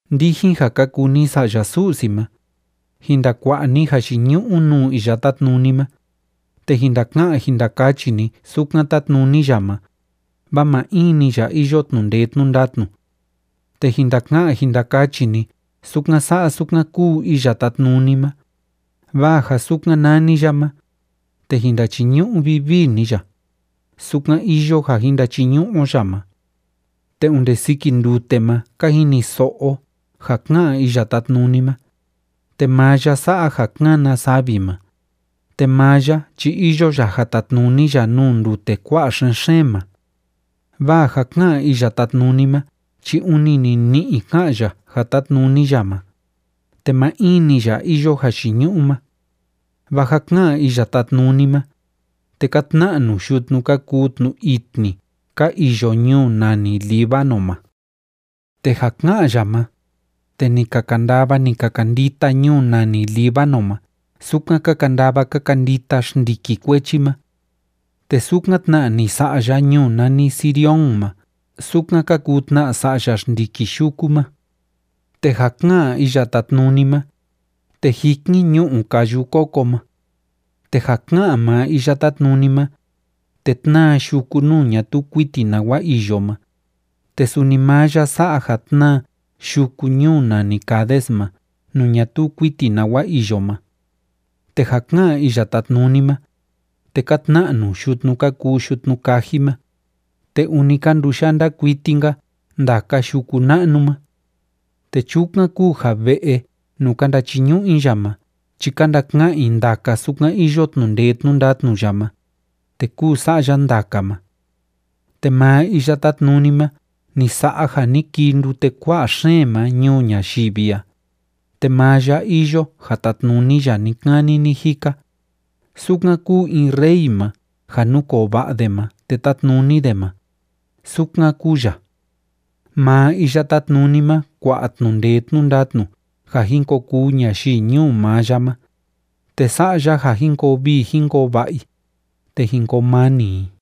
Ndijin ja ka kuu ni sa'ya Su'si ma, jin ndakua'a ni jayiñu'u nuu Iya Tátnuni ma, te jin ndaka'an jin ndakachi ni sukan tátnuni ya ma, vaa maa in‑ni ya iyo tnu'u ndee tnu'u ndatnu. Te jin ndaka'an jin ndakachi ni sukan sa'a sukan kúu Iya Tátnuni ma, vaa ja sukan nani ya ma, te jin ndachiñu'u vivii ni ya, sukan iyo ja jin ndachiñu'u o ya ma. Te onde siki ndute ma ka jiniso'o o ja ká'an Iya Tátnuni ma, te maa ya sa'a ja kána savi ma, te maa ya chi iyo ya ja tatnuni ya nuu ndute kua'a xen‑xeen ma. Vaa ja ká'an Iya Tátnuni ma chi ûni nini'i ká'an ya ja tátnuni ya ma, te maa in‑ni ya iyo jayiñu'u ma. Vaa ja ká'an Iya Tátnuni ma, te ka tna'nu yutnu ka kuu tnu itni ka iyo ñuu nani Líbano ma. Te ja ká'an ya ma, te ni ka kandava, ni ka kandita ñuu nani Líbano ma sukan ka kandava ka kandita xndiki kuechi ma. Te sukan tna ni sa'a ya ñuu nani Sirión ma sukan ka kuu tna sa'ya xndiki yuku ma. Te ja ká'an Iya Tátnuni ma, te jikin ñu'u káyu kóko ma. Te ja ká'an maa Iya Tátnuni ma, te tnáa yuku nuu ñatuu kuiti nawa iyo ma, te suni maa ya sa'a ja tnáa yuku ñuu nani Cades ma nuu ñatuu kuiti nawa iyo ma. Te ja ká'an Iya Tátnuni ma, te ka tna'nu yutnu ka kuu yutnu kaji ma, te ûni ka nduyanda kuiti‑nka ndaka yuku na'nu ma. Te chukan kúu ja ve'e nuu ka ndachiñu'u i ya ma chi ka ndaka'an i ndaka sukan iyo tnu'u ndee tnu'u ndatnu ya ma, te kúu sa'a ya ndaka ma. Te maa Iya Tátnuni ma ni sa'a ja ni kii ndute kua'a xeen ma ñuu ñayivi a, te maa ya iyo ja tatnuni ya ni‑kani ni‑jika, sukan kúu in Rey ma ja núkoo va'a de ma te tátnuni de ma, sukan kúu ya. Maa Iya Tátnuni ma kua'a tnu'u ndee tnu'u ndatnu ja jin ko kuu ñayii ñuu maa ya ma, te sa'a ya ja jin koo vii jin koo va'a i, te jin koo mani i.